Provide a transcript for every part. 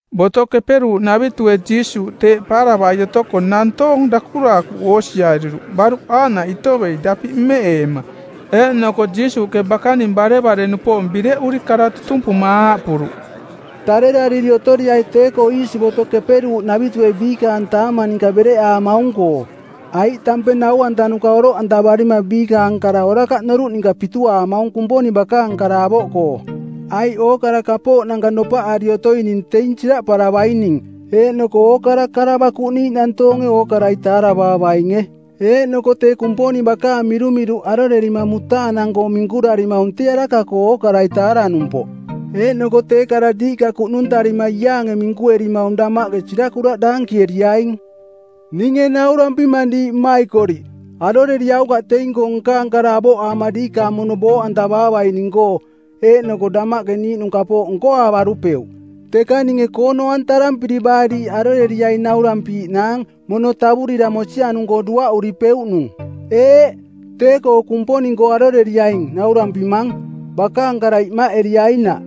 Boto Keperuuꞌnavitue Jiisuuꞌ teeꞌ paaravai otoko nantoong dakuraakuꞌ oosiariruꞌ baruꞌ aaꞌnaꞌ itovei dapiꞌ mmeꞌeema. Eeꞌnoko Jiisuuꞌke bakaning barevare-nupoong bireꞌuri kara tutumpuma aaꞌpuruꞌ, “Tarerariri otoriai tee-koo iisi Boto Keperuuꞌnavitue biikaang taamang ninka bereꞌaamaung-koo, aiꞌ tampeng nau-antanuka oroꞌantavarima biikaang kara orakaꞌ noruꞌ ninka pituaamaung Kumponing bakaang kara avoꞌkoo. Aiꞌ ookara kapooꞌnanka nopaꞌari otoining teing siraꞌparavaining. Eeꞌnoko ookara kara bakuꞌniiꞌ nantoonge ookarai taaravaavainge. Eeꞌnoko tee Kumponing bakaang mirumiruꞌ arorerima mutaanang-koo minkurarimaung tee araka-koo ookarai taaranumpoꞌ. Eeꞌnoko tee kara diiꞌka kuꞌnuntarima iaange minkuerimaung damaꞌke sirakuraꞌ daankieriaing. “Ninge naurampimang diiꞌ mmaikoriꞌ, aroreriaukaꞌ teing-koo nkaang kara avoꞌaama diikaang mono booꞌantavaavaining-koo eeꞌnoko damaꞌke niiꞌnung kapooꞌ nkoaavarupeuꞌ. Teka ninge koono-antarampiri baa diiꞌ aroreriaing naurampiiꞌnaang, mono tavurira mosianung-koo duaꞌduripeuꞌnung. Eeꞌ, tee-koo Kumponing-koo aroreriaing naurampimang, bakaang kara imaꞌeriainaꞌ.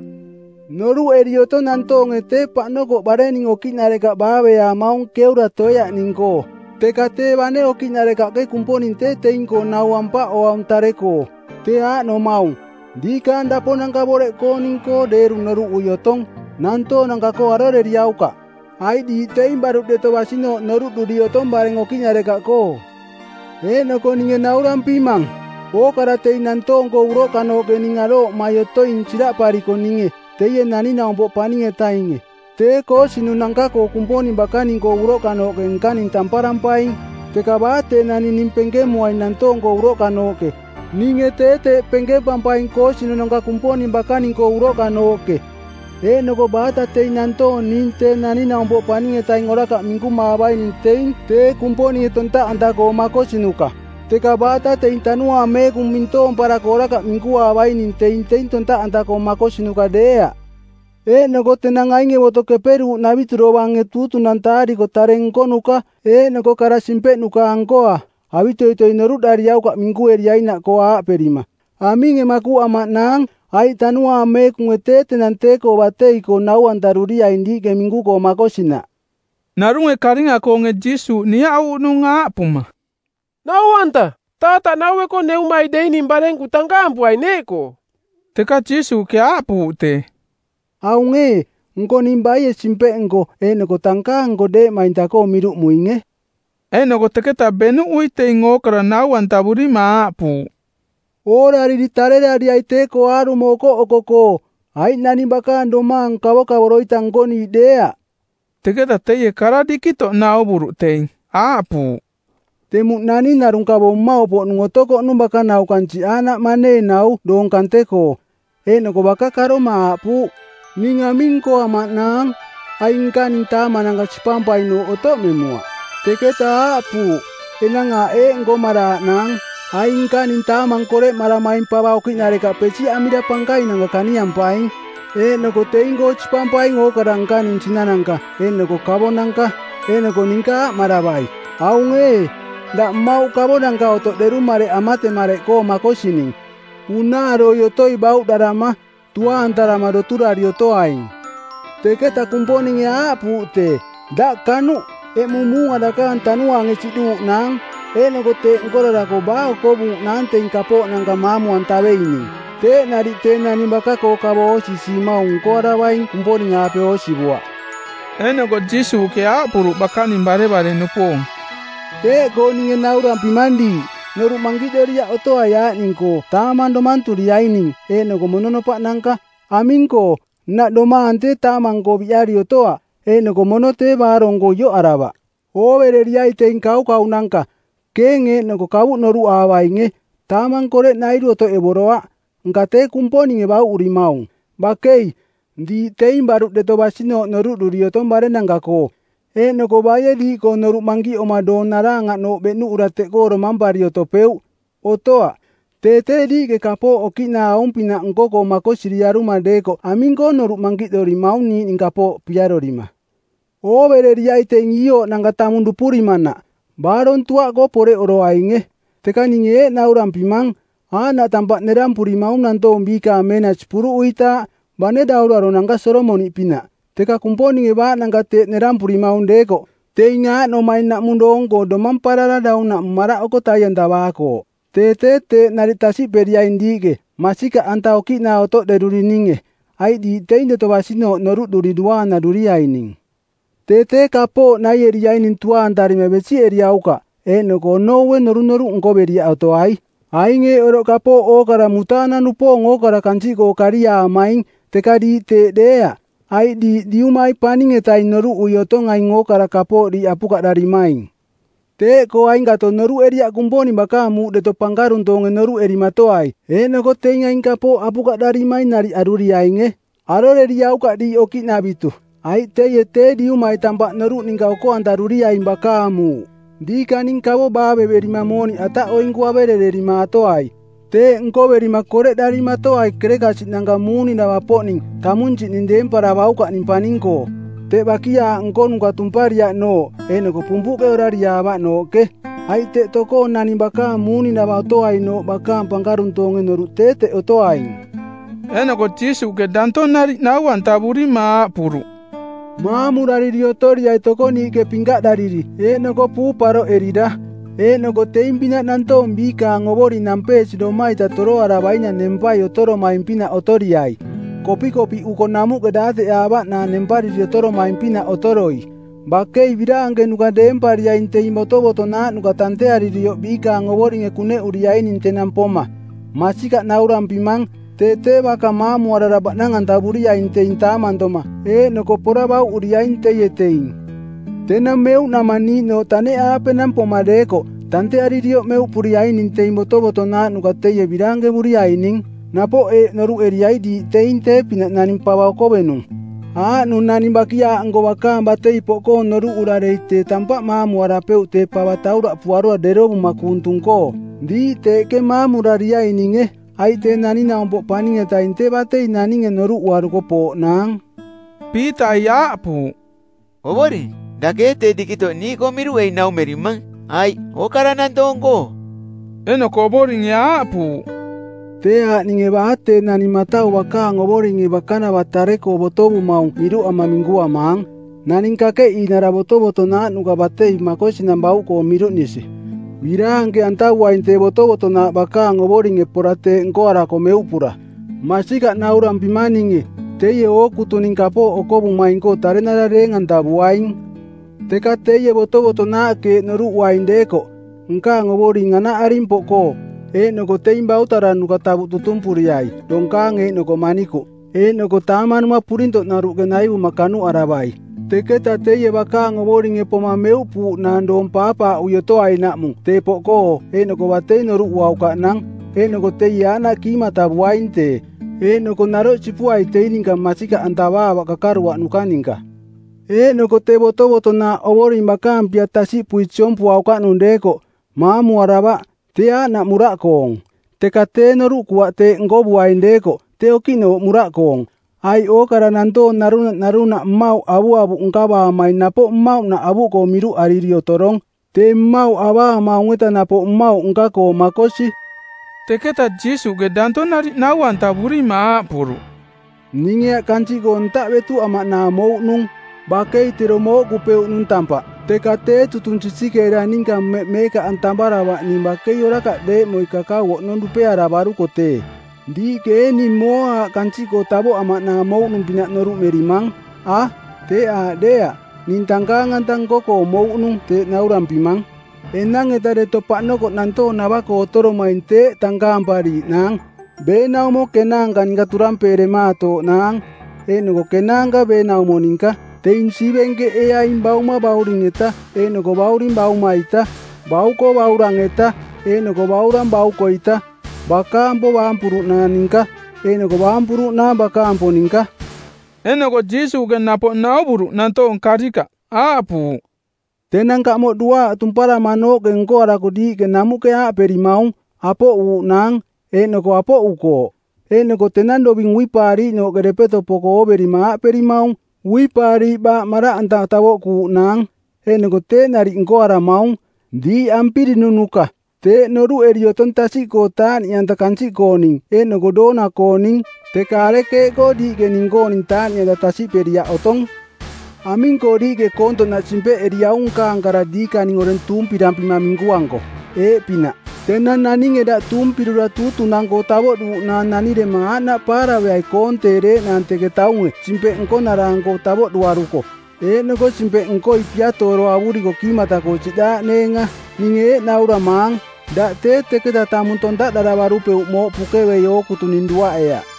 Noruꞌeri otong nantoonge tee paꞌnokoꞌ barenning okiꞌnarekaꞌ baaveaamaung keura toeaꞌning-koo, teka tee bane okiꞌnarekaꞌke Kumponing tee teing-koo nau ampaꞌoaung tare-koo. Tee aaꞌnomaung, diikaang daponanka boreꞌkooning-koo deeru noruꞌui otong. Nantoonanka-koo aroreriaukaꞌ, aiꞌ diiꞌ teing baruꞌ deto basinooꞌ noruꞌduri otong bareng okiꞌnarekaꞌkoo. “Eeꞌnoko ninge naurampimang, ookara teing nantoong-koo uroꞌkanooꞌke ning arooꞌmai otoing siraꞌpariko ninge, Teie Naning-naumpoꞌ Paning-etainge, tee koosinunanka-koo Kumponing bakaning-koo uroꞌkanooꞌke nkaning tamparampaing. Teka baa tee naning ning penkemuaing nantoong-koo uroꞌkanooꞌke, ninge tee teeꞌ penkempampaing koosinunanka Kumponing bakaning-koo uroꞌkanooꞌke. “Eeꞌnoko baata teing nantoong ning Tee Naning-naumpoꞌ Paning-etaing orakaꞌ minkumaavaining teing tee Kumponinge tontaꞌanta-koo makosinuka, teka baata teing Tanuaang Meekung mintoomparako orakaꞌ minkuaavaining teing teing tontaꞌanta-koo makosinuka deeaꞌ. “Eeꞌnoko tenang ainge Boto Keperuuꞌnavitu dovange tuutunantaariko tare nkonuka eeꞌnoko kara simpeꞌnuka-ankoa, avitoitoi noruꞌdariaukaꞌ minkueriainaꞌkoo aaꞌperima, ‘Aminge makuꞌamaꞌnaang?’ Aiꞌ Tanuaang Meekunge tee tenang tee-koo batei-koo nau-antaruriaing diiꞌke minku-koo makosinaꞌ.” Narunge karinga-koonge Jiisuuꞌ niaꞌuuꞌnung aaꞌpuma, “Nau-anta, taataꞌ naueko neumai deining barenku tankaampuai neeꞌkoo.” Teka Jiisuuꞌke aaꞌpuuꞌ tee, “Aung ee, nko ning baie simpeꞌnko˜ eeꞌnoko tankaang-nko deeꞌmainta-koo miruꞌmuinge?” Eeꞌnoko teketa beꞌnuꞌui teing ookara nau-antavurima aaꞌpuuꞌ, “Oorariri tarerariai tee-koo aarumo okoꞌoko-koo, aiꞌ naning bakaang domaang kavokavoro-ita nkoniiꞌ deeaꞌ.” Teketa teie kara dikitoꞌ nauvuruꞌ teing; aaꞌpuuꞌ, “Temuꞌ naning narung kavo mmauꞌpoꞌnung otokoꞌnung bakanau kansiꞌ aaꞌnaꞌ maneenau doong kante-koo. Eeꞌnoko baka karoma aaꞌpuuꞌ: Ning aming nkoamaꞌnaang? Aing nkaning taamananka sipampainooꞌ otoꞌmemuaꞌ. Teketa aaꞌpuuꞌ: Enang aaꞌ eeꞌ nkoamaꞌnaang, aing nkaning taamang koreꞌmaramaing pava okiꞌnarekaꞌ pesiꞌamira pankainanka kaniampaing, eeꞌnoko teing-koo sipampaing ookara nkaning sinananka eeꞌnoko kavonanka. Eeꞌnoko ninka aaꞌmaravai: Aung ee, daꞌ mmauꞌ kavonanka otoꞌderung mareꞌ amatemareꞌkoo makosining. Unaaroi otoi bauꞌdarama, tuaantarama doturari otoaing. Teketa Kumponinge aaꞌpuuꞌ tee, ‘Daꞌ kanuꞌ, eꞌmung muunga dakaang tanuaange siꞌduuꞌnaang, eeꞌnoko teeꞌ nkorarako baa okovuuꞌnaang teing kapooꞌnanka maamu-antaveining?’ Teeꞌ nariꞌ tee naning baka-koo kavo oosisiimaung nkoaravaing Kumponing-aape oosivuaꞌ.” Eeꞌnoko Jiisuuꞌke aaꞌpuruꞌ bakaning barevare-nupoong, “Teeꞌkoo ninge naurampimang diiꞌ, noruꞌ mankiꞌdoriaꞌ otoai aaꞌning-koo taamang domanturiaining eeꞌnoko mononopaꞌnanka. Aming-koo, nnaꞌ domaang tee taamang-koo biꞌari otoaꞌ eeꞌnoko mono tee baarong-koo ioꞌaravaꞌ. Oovereriai teing kaukaunanka, keeng eeꞌnoko kavuꞌ noruꞌaavainge, taamang koreꞌnairu otoꞌevoroaꞌ, nka tee Kumponinge bauꞌurimaung. Bakei, diiꞌ teing baruꞌ deto basinooꞌ noruꞌduri otong barennanka-koo. “Eeꞌnoko baie diiꞌkoo noruꞌ mankiꞌoma doong naraangaꞌnooꞌ beꞌnuꞌura teꞌkoo domampari otopeuꞌ? Otoaꞌ. Tee tee diiꞌke kapooꞌ okiꞌnaa aung-pinaꞌ nko-koo makosiriaruma deekoꞌ aming-koo noruꞌ mankiꞌdorimaung niiꞌning kapooꞌ piarorima? Oovereriai teing iiooꞌnanka tamung dupurimanaꞌ, baarong tuaꞌkoo poreꞌoroainge. Teka ninge eeꞌ naurampimang, aaꞌnaꞌ tampaꞌ nerampurimaung nantoong biikaang meenasi puruꞌuitaaꞌ, bane dauraronanka Solomoniꞌpinaꞌ. Teka Kumponinge baaꞌnanka teeꞌ nerampurimaung deekoꞌ, teing aaꞌnomaing naꞌmung doong-koo domamparara daunaꞌmung maraꞌoko tai-antavaakooꞌ, tee tee teeꞌ nariꞌ tasiꞌperiaing diiꞌke, masikaꞌanta okiꞌnaa otoꞌderurininge, aiꞌ diiꞌ teing deto basinooꞌ noruꞌduri duaanaruriaining. Tee tee kapooꞌ naieriaining tuaantarima besiꞌeriaukaꞌ eeꞌnoko onoue norunoruꞌ nkoveriaꞌ otoai. Aing eeꞌ oroꞌ kapooꞌ ookara mutaanang-nupoong ookara kansiꞌkoo kaariaamaing, teka diiꞌ teeꞌ deeaꞌ, aiꞌ diiꞌ Diumai paning-etaing noruꞌui otong aing ookara kapooꞌ diiꞌ apukaꞌdarimaing. “Teeꞌkoo ainkato noruꞌeriaꞌ Kumponing bakaang muuꞌ deto pankaruntoonge noruꞌerimatoai, eeꞌnoko teing aing kapooꞌ apukaꞌdarimaing nariꞌ aruriainge. Aroreriaukaꞌ diiꞌ okiꞌnavitu, aiꞌ teie tee Diumai tampaꞌ noruꞌ ninka oko-antaruriaing bakaang muuꞌ. Diikaning kavo baaveverima mooniꞌ ataꞌoinku averererimaatoai. Teeꞌ nkoverima koreꞌdarimatoai kerekasiꞌnanka muuninava-poꞌning˜ tamunsiꞌning deemparavaukaꞌning paning-koo. Teꞌ bakiaaꞌ nkonuka tumpariaꞌnooꞌ eeꞌnoko pumpuꞌke orariaavaꞌnooꞌke. Aiꞌ ‘teꞌ tokoo naning bakaang muuninava otoainooꞌ bakaang pankaruntoonge noruꞌ tee teꞌ otoaing.’” Eeꞌnoko Jiisuuꞌke danto nariꞌ nau-antavurima aaꞌpuruꞌ, “Maamurariri otoriai tokoniiꞌke pinkaꞌdariri, eeꞌnoko puu paroꞌerira. Eeꞌnoko teing-pinaꞌ nantoong biikaang ovoring nampeesiroma-ita toroaravainang nempai otoromaing-pinaꞌ otoriai, kopikopiꞌuko namuꞌke daateꞌaavaꞌnaang nempariri otoromaing-pinaꞌ otoroi. Bakei biraankenuka deempariaing teing botovotonaaꞌnuka tantearirioꞌ biikaang ovoringe kuneꞌuriaining tenang poma. Masikaꞌ naurampimang, tee tee baka mamuarara baꞌnang-antavuriaing teing taamantoma eeꞌnoko pora bauꞌuriaing teie teing. Tenang meuꞌnamang niiꞌnooꞌ taneꞌaapenang poma deekoꞌ, tantearirioꞌ meuꞌpuriaining teing botovotonaaꞌnuka teie biraankevuriaining. “Napoꞌ eeꞌ noruꞌeriai diiꞌ teing tee-pinaꞌ naning pava okovenung, aaꞌnung naning bakiaaꞌnko bakaang batei poꞌkoong noruꞌura dei tee tampaꞌ maamuarapeuꞌ tee pava tauraꞌpuarura derovuma kuung tung-koo. Diiꞌ teeꞌke maamurariaininge, aiꞌ Tee Naning-naumpoꞌ Paning-etaing tee batei naninge noruꞌuaruko pooꞌnaang.” Piitai aaꞌpuuꞌ, “Ovoring, dake ee tee dikitoꞌ niiꞌkoo miruꞌei naumerimang aiꞌ ookara nantoong-koo?” Eeꞌnoko Ovoringe aaꞌpuuꞌ, “Tee aaꞌ ninge baa tee naning matau bakaang ovoringe bakanava tare-koo botovumaung miruꞌama minkuamaang, naning kakeꞌiinara botovotonaaꞌnuka batei makosinang bauꞌkoo miruꞌnisi. Biraanke-antavuaing tee botovotonaaꞌ bakaang ovoringe pora teeꞌ nkoarako meuꞌpura. Masikaꞌ naurampimang ninge, teie ookutuning kapooꞌ okovumaing-koo tarenara deeng-antavuaing. Teka teie botovotonaaꞌke eeꞌ noruꞌuaing deekoꞌ, ‘Nkaang ovoring anaꞌaring poꞌkoo,’ eeꞌnoko teing bautaranuka tavuꞌ tutumpuriai donkaang eeꞌnoko manikuꞌ, eeꞌnoko taamanuma purintoꞌnaruꞌke naivuma kanuꞌaravai. Teketa teie bakaang ovoringe poma meuꞌpuuꞌnaang doong paapaaꞌui otoainaꞌmung tee poꞌkoo eeꞌnoko batei noruꞌuaukaꞌnang. Eeꞌnoko teie aaꞌnaꞌ kiimatavuaing tee, eeꞌnoko naroꞌ sipuai teing ninka masikaꞌantavaavaꞌ kakaruaꞌnuka ninka. Eeꞌnoko tee botovotonaaꞌ ovoring bakaang pia tasiꞌpui siompuaukaꞌnung deekoꞌ, maamuaravaꞌ, tee aaꞌnaꞌ muraꞌkoong. Teka tee noruꞌkuaꞌ teeꞌ nkovuaing deekoꞌ tee okiꞌnooꞌ muraꞌkoong. Aiꞌ ookara nantoong narunaꞌ narunaꞌ mmauꞌ avuavuꞌ nkavaamaing napoꞌ mmauꞌnaꞌ avuꞌkoo miruꞌariri otorong. Tee mmauꞌ avaamaung-eta napoꞌ mmauꞌ nka-koo makosi.” Teketa Jiisuuꞌke danto nariꞌ nau-antavurima aaꞌpuruꞌ, “Ninge aꞌ kansiꞌkoo ntaꞌ betuꞌamaꞌnaang mouꞌnung. Bakei tero mooꞌkupeuꞌnung tampaꞌ. Teka tee tutung sisikeera ninka mmeꞌ meekaꞌantamaravaꞌ ning bakei orakaꞌ deeꞌmoi kakau oꞌnong dupearavaruko tee. Diiꞌke ee ning mooa aꞌ kansiꞌkoo tavoꞌamaꞌnaang mouꞌnung-pinaꞌ noruꞌmerimang? A, teeꞌ aaꞌ deeaꞌ, ning tankaang-anta nko-koo mouꞌnung teeꞌ naurampimang. Enang-eta deto paꞌnokoꞌ nantoong nava-koo otoromaing teeꞌ tankaampariiꞌnaang, beenaumo kenaanka ninka turampeematooꞌnaang, eeꞌnoko kenaanka beenaumo ninka. Teing siivenkeꞌeeaing bauma bauring-eta eeꞌnoko bauring bauma-ita; bauko baurang-eta eeꞌnoko baurang bauko-ita; bakaampo baampuruꞌnaang ninka eeꞌnoko baampuruꞌnaang bakaampo ninka.” Eeꞌnoko Jiisuuꞌke napoꞌ nauvuruꞌ nantoong karikaꞌ, aaꞌpuuꞌ, “Tenang kamoꞌ duaaꞌ tumparamanooꞌke nkoarako diiꞌke namuꞌke aaꞌperimaung: Apoꞌuuꞌnaang. Eeꞌnoko apoꞌukooꞌ. Eeꞌnoko tenang doving uipaariiꞌnooꞌke depeto poko ooverima aaꞌperimaung: Uipaariiꞌ baaꞌ maraꞌanta tavoꞌkuuꞌnaang. Eeꞌnoko teeꞌ nariꞌ nkoaramaung. Diiꞌ ampirininuka, teeꞌ noruꞌeri otong tasiꞌkoo taaꞌniꞌanta kansiꞌkooning eeꞌnoko doona-kooning. Teka arekeeꞌkoo diiꞌke ning-kooning taaꞌniꞌanta tasiꞌperiaꞌ otong? Aming-koo diiꞌke koontoꞌnaꞌ simpeꞌeriaung nkaang kara diikaning oreng tuumpirampima minkuanko? Eeꞌpinaꞌ, tenang naninge daꞌ tuumpirura tuutunang-koo tavoꞌduuꞌnaang nanirema aaꞌnaꞌ paaraveai koonteereeꞌnaang teke taunge simpeꞌ nkonara-anko tavoꞌduaruko, eeꞌnoko simpeꞌnkoi piatooro avuriko kiimata-koo siꞌdaaꞌneenga. Ninge eeꞌ nauramaang, daꞌ tee teketa tamung tontaꞌdaravarupeuꞌ mooꞌ pukevei ookutuning duaꞌeaꞌ.”